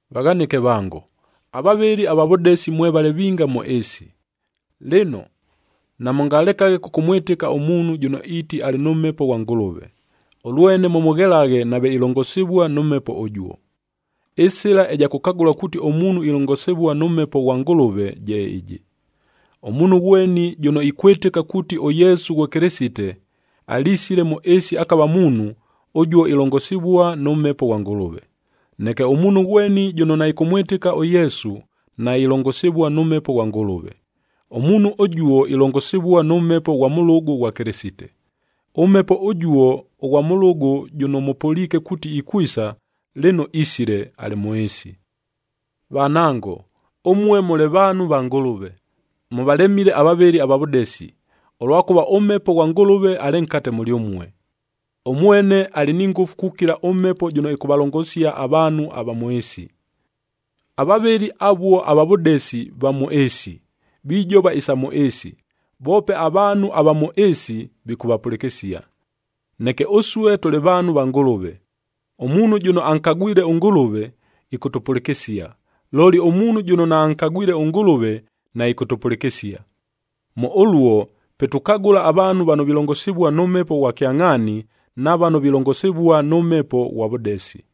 Vaghanɨke vango, avavɨli ava vʉdesi mwevale vinga mʉ ɨɨsi. Lɨno, namʉngakelaghe kʉkʉmwɨtɨka ʉmuunhu jʉno iiti alɨ nʉ Mhepo ghwa Ngʉlʉve, ʉlwene mʉmʉghelaghe nave ilongosivua nʉ Mhepo ʉjuo. Ɨsɨla ɨja kʉkagʉla kuuti ʉmuunhu ilongosivua nʉ Mhepo ghwa Ngʉlʉve je ɨjɨ: Ʉmuunhu ghweni jʉno ikwɨtɨka kuuti ʉYesu ghwe Kɨlɨsite, alisile mʉ ɨɨsi akava muunhu, ʉjuo ilongosivua nʉ Mhepo ghwa Ngʉlʉve. Neke ʉmuunhu ghweni jʉno naɨkʉmwɨtɨka ʉYesu, nailongosivua nʉ Mhepo ghwa Ngʉlʉve. Ʉmuunhu ʉjuo, ilongosivua nʉ mhepo ghwa mʉlʉgʉ ghwa Kɨlɨsite. Ʉmhepo ʉjuo ʉghwa mʉlʉgʉ jʉno mʉpʉliike kuuti ikwisa, lɨno isile, alɨ mʉ ɨɨsi. Vanango, ʉmue mʉlɨ vaanhu va Ngʉlʉve, mʉvalemile avavɨli ava vʉdesi, ʉlwakʉva ʉMhepo ghwa Ngʉlʉve alɨ nkate mʉlyʉmue. Ʉmwene alɨ ni ngʉfu kukila ʉmhepo jʉno ɨkʉvalongosia avaanhu ava mʉ ɨɨsi. Avavɨli avuo ava vʉdesi va mʉ ɨɨsi, vijova isa mʉ ɨɨsi, voope avaanhu ava mʉ ɨɨsi, vikʉvapʉlɨkɨsia. Neke ʉsue tʉlɨ vaanhu va Ngʉlʉve. Ʉmuunhu jʉno ankagwile ʉNgʉlʉve, ɨkʉtʉpʉlɨkɨsia; looli ʉmuunhu jʉno naankagwile ʉNgʉlʉve, naɨkʉtʉpʉlɨkɨsia. Mʉ ʉluo, pe tukagʉla avaanhu vano vilongosivua nʉ Mhepo ghwa kyangʼhaani na vano vilongosivua nʉ mhepo ghwa vʉdesi.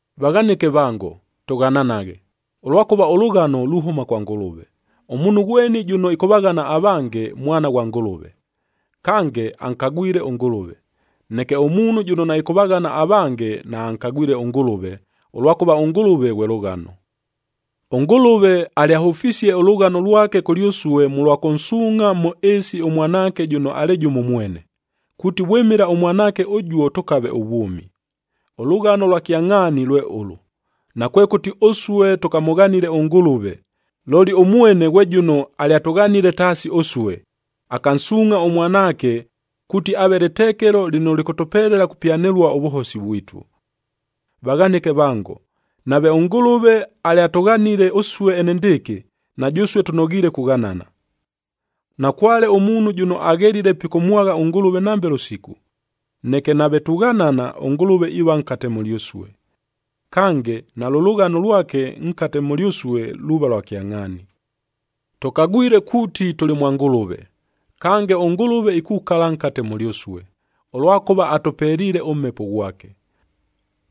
Vaghanɨke vango, tʉghananaghe, ʉlwakʉva ʉlʉghano luhʉma kwa Ngʉlʉve. Ʉmuunhu ghweni jʉno ɨkʉvaghana avange, mwana ghwa Ngʉlʉve, kange ankagwile ʉNgʉlʉve. Neke ʉmuunhu jʉno naɨkʉvaghana avange, naankagwile ʉNgʉlʉve, ʉlwakʉva ʉNgʉlʉve ghwe lʉghano. ɄNgʉlʉve alyahʉfisie ʉlʉghano lwake kʉlyʉsue mʉlwa kʉnsuungʼha mʉ ɨɨsi ʉMwanaake jʉno alɨ jʉmo mwene, kuuti vwɨmɨla ʉMwanaake ʉjuo tʉkave ʉvwʉmi. Ʉlʉghano lwa kyangʼhaani lwe ʉlʉ: Nakwekʉti ʉsue tʉkamʉghanile ʉNgʉlʉve, looli ʉmwene ghwe jʉno alyatʉghanile taasi ʉsue, akansuungʼha ʉMwanaake, kuuti aave lɨtekelo lɨno lɨkʉtʉpelela kupyanɨlua ʉvʉhosi vwitu. Vaghanɨke vango, nave ʉNgʉlʉve alyatʉghanile ʉsue enendɨɨkɨ, na jʉsue tʉnoghiile kughanana. Nakwale ʉmuunhu jʉno aghelile pikʉmwagha ʉNgʉlʉve nambe lʉsiku. Neke nave tughanana, ʉNgʉlʉve iiva nkate mʉlyʉsue. Kange, nalʉ lʉghano lwake nkate mʉlyʉsue luuva lwa kyangʼhaani. Tʉkagwile kuuti tʉlɨ mwa Ngʉlʉve, kange ʉNgʉlʉve ikukala nkate mʉlyʉsue, ʉlwakʉva atʉpeliile ʉMhepo ghwake.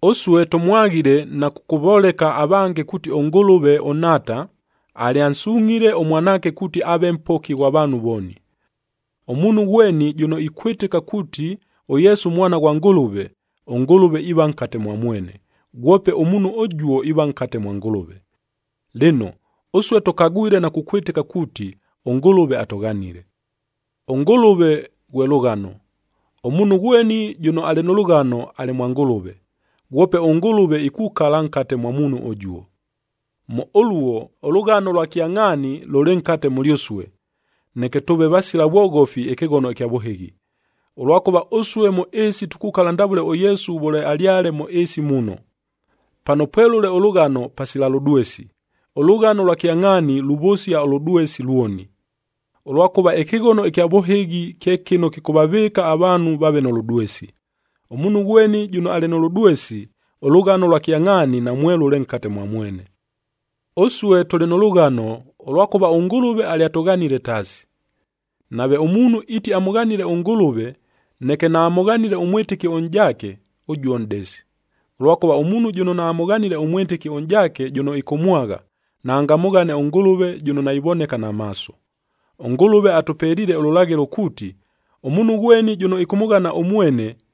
Ʉsue tʉmwaghile na kʉkʉvoleka avange kuuti ʉNgʉlʉve ʉNhaata, alyansungʼhile ʉMwanaake kuuti aave Mpoki ghwa vaanhu vooni. Ʉmuunhu ghweni jʉno ikwɨtɨka kuuti, ʉYesu Mwana ghwa Ngʉlʉve, ʉNgʉlʉve iiva nkate mwa mwene, ghwope ʉmuunhu ʉjuo iiva nkate mwa Ngʉlʉve. Lɨno, ʉsue tʉkagwile na kukwɨtɨka kuuti ʉNgʉlʉve atʉghanile. ɄNgʉlʉve ghwe lʉghano. Ʉmuunhu ghweni jʉno alɨ nʉ lʉghano, alɨ mwa Ngʉlʉve, ghwope ʉNgʉlʉve ikukala nkate mwa muunhu ʉjuo. Mʉ ʉluo, ʉlʉghano lwa kyangʼhaani lʉlɨ nkate mʉlyʉsue, neke tʉʉve vasila vwoghofi ɨkɨghono ɨkya vʉhɨghi, ʉlwakʉva ʉsue mʉ ɨɨsi tukukala ndavʉle ʉYesu vʉle alyale mʉ ɨɨsi muno. Pano pwelʉle ʉlʉghano, pasila lʉdwesi, ʉlʉghano lwa kyangʼhaani luvʉsia ʉlʉdwesi lwoni. Ʉlwakʉva ɨkɨghono kya vʉhɨghi kye kɨno kɨkʉvavɨɨka avaanhu vaave nʉ lʉdwesi. Ʉmuunhu ghweni jʉno alɨ nʉ lʉdwesi, ʉlʉghano ʉlwa kyangʼhaani namwelʉle nkate mwa mwene. Ʉsue tʉlɨ nʉ lʉghano, ʉlwakʉva ʉNgʉlʉve alyatʉghanile taasi. Nave ʉmuunhu iiti amʉghanile ʉNgʉlʉve, neke naamʉghanile ʉmwɨtɨki ʉnʼjaake, ʉjuo nʼdesi. Ʉlwakʉva ʉmuunhu jʉno naamʉghanile ʉmwɨtɨki ʉnʼjaake jʉno ɨkʉmwagha, naangamʉghane ʉNgʉlʉve jʉno naivoneka na maaso. ɄNgʉlʉve atʉpeliile ʉlʉlaghɨlo kuuti, ʉmuunhu ghweni jʉno ɨkʉmʉghana ʉmwene,